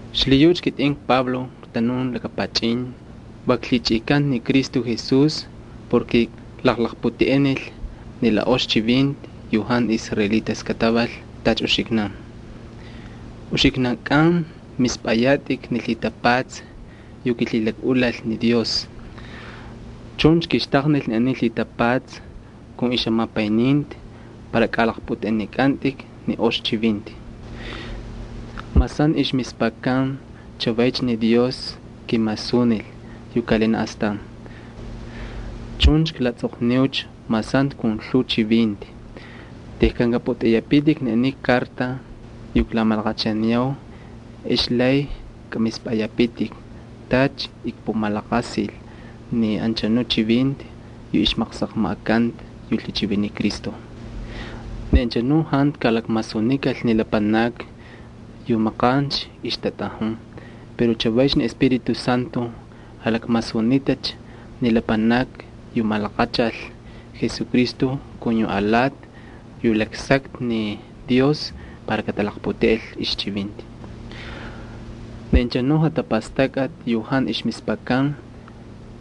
Xlhiyucha kitꞌin kPablo ktanun laka pachꞌin, va klhichꞌikanta ni Cristo Jesús porke klaqlaqputeꞌenil ni la ox chivinti yu jantu israelitas kataval tacha uxiknan. Uxiknankꞌan mispꞌayatꞌik ni lhitapatsa yu kilhilakꞌulal ni Dios. Chuncha kixtaqnil ni aniy lhitapatsa kun ixjamapayninti para kalaqpꞌuteꞌenikꞌantꞌik ni ox chivinti. Mas jantu ixmispakan, chavaycha ni Dios kimasunil yu kaꞌalinaꞌ astan. Chuncha klatsꞌoqniucha mas jantu kun lhuu chivinti. Tejkan kꞌapꞌutꞌeꞌeyapitik ni aniy karta yu klamalaqachaniyau ex lay kꞌamispꞌayapitik tacha kpumalaqasil ni anchanu chivinti yu ixmaqsaqmaꞌakanta yu lhichiviniy Cristo. Ni anchanu jantu kalakmasunikal ni lapanakni yu maqancha ixtatꞌajun. Pero chavaycha ni Espíritu Santo jalakmasunitacha ni lapanakni yu malaqachal Jesucristo kun yu alati yu jalaksakta ni Dios para katalaqputeꞌel ixchivinti. Ni anchanu jatapastakꞌati yu jantu ixmispakan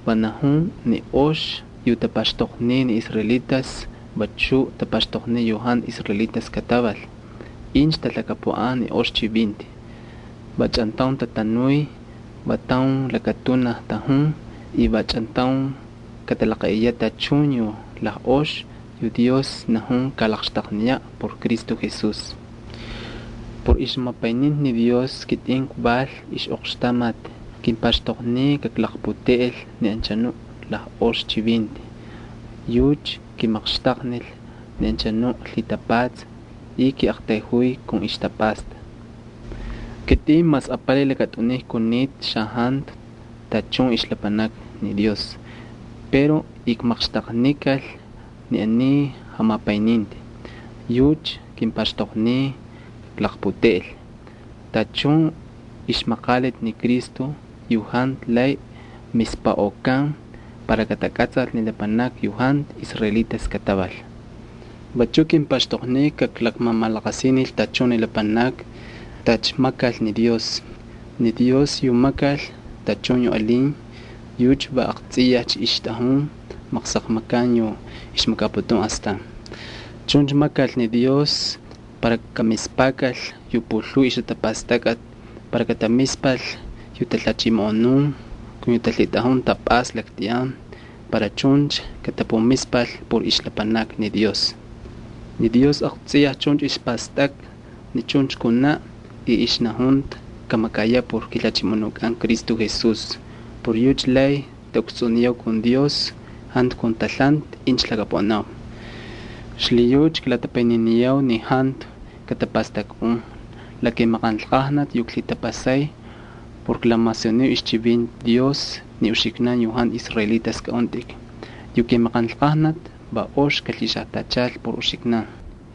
va najun ni ox yu tapaxtoqniy ni israelitas vachu tapaxtoqniy yu jantu israelitas kataval incha talhakapuꞌan ni ox chivinti. Va chꞌantaun tatanuy, va taun lakatunaj tajun, y va chꞌantaun katalaqaꞌiyaꞌ tachun yu lajꞌox yu Dios najun kalaqxtaqniyaꞌ por Cristo Jesús. Por ixjamapayninti ni Dios kitꞌin kval ixꞌoqxtamati. Kimpaxtoqniy kaklaqputeꞌel ni anchanu lajꞌox chivinti. Yucha kimaqxtaqnil ni anchanu lhitapatsa y kiꞌaqtayjuy kun ixtapꞌasta. Kitꞌin mas apalay lakatꞌuniy kunita xajantu tachun ixlapanakni ni Dios pero ikmaqxtaqnikal ni aniy jamapayninti. Yucha kimpaxtoqniy kaklaqputeꞌel tachun ixmaqaliti ni Cristo yu jantu lay mispaꞌokan para katakꞌatsal ni lapanakni yu jantu israelitas kataval. Vachuꞌ kimpaxtoqniy kaklaqmamalaqasinil tachun ni lapanakni tacha makal ni Dios. Ni Dios yu makal tachun yu alin yucha va aqtsꞌiyajcha ixtꞌajun maqsaqmakan yu ixmakaputun astan. Chuncha makal ni Dios para kamispakal yu pulhuu ixjatapastakꞌati, para katamispal yu talhachimoꞌonun kun yu talhitꞌajun tapꞌasta laktꞌiyan, para chuncha katapumispal por ixlapanakni ni Dios. Ni Dios aqtsꞌiyaj chuncha ixpastakta ni chuncha kunaꞌ y ixnajunta kamakayaꞌ por kiJalhachimoꞌonukꞌan Cristo Jesús. Por yucha lay taꞌukstsꞌuniniyau ni Dios jantu kun talhanti incha lhakapuꞌanau. Xlhiyucha klatapayniniyau ni jantu katapastakꞌun la kimaqanlqajnati yu klhitapasay por klamasuniu ixchivinti Dios ni uxiknan yu jantu israelitas kꞌaꞌuntꞌik. Yu kimaqanlqajnati va ox kalhixajtachal por uxiknan.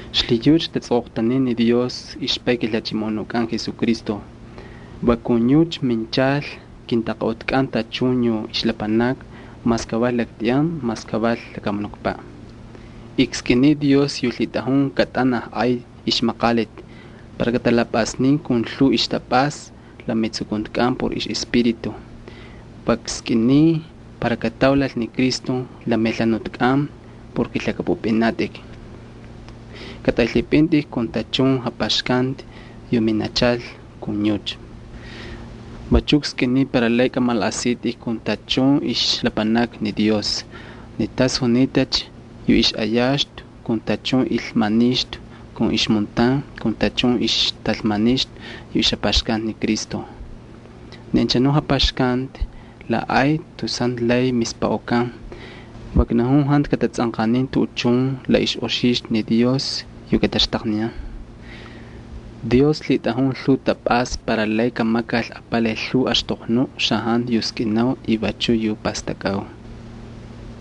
Xlhiyucha iktatsoqoqtaniy ni Dios ixPay kiJalhachimoꞌonukꞌan Jesucristo. Va kun yucha minchal kintaqaꞌutkꞌan tachun yu ixlapanakni mas kaval laktꞌiyan mas kaval lakamunukpaꞌ. Ikskꞌiniy Dios yu lhitꞌajun katꞌanaj ay ixmaqaliti para katalapꞌasnin kun lhuu ixtapꞌasta la metsukuntikꞌan por ixꞌEspíritu. Va kskꞌiniy para kataulal ni Cristo la melhanutkꞌan porke lhakꞌapꞌupꞌinatꞌik. Katꞌaylhipꞌintꞌik kun tachun japaxkanti yu minachal kun yucha. Vachu kskꞌiniy para lay kꞌamalaꞌasitꞌik kun tachun ixlapanakni ni Dios ni tas junitacha yu ixꞌayaxtu kun tachun ilmanixtu kun ixmuntan kun tachun ixtalmanixtu yu ixjapaxkanti ni Cristo. Ni anchanuꞌ japaxkanti la ay tus jantu lay mispaꞌokan. Va knajun jantu katatsꞌanqanin tuꞌuchun la ixꞌoxixtu ni Dios yu kataxtaqniyan. Dios lhitꞌajun lhuu tapꞌasta para lay kamakal apalay lhuu axtoqnuꞌ xajantu yu skꞌinau y vachuꞌ yu pastakꞌau.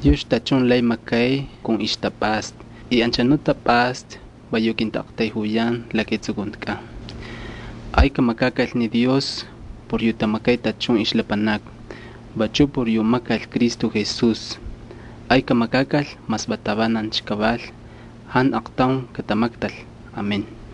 Yucha tachun lay makay kun ixtapꞌasta. Anchanuꞌ tapꞌasta va yu kintaꞌaqtayjuyan la ketsukuntikꞌan. Ay kamakakal ni Dios por yu tamakay tachun ixlapanakni y vachu por yu makal Cristo Jesús. Ay kamakakal mas va tavanancha kaval, jantu aqtaun katamaktayaꞌ. Va chuncha kavalcha.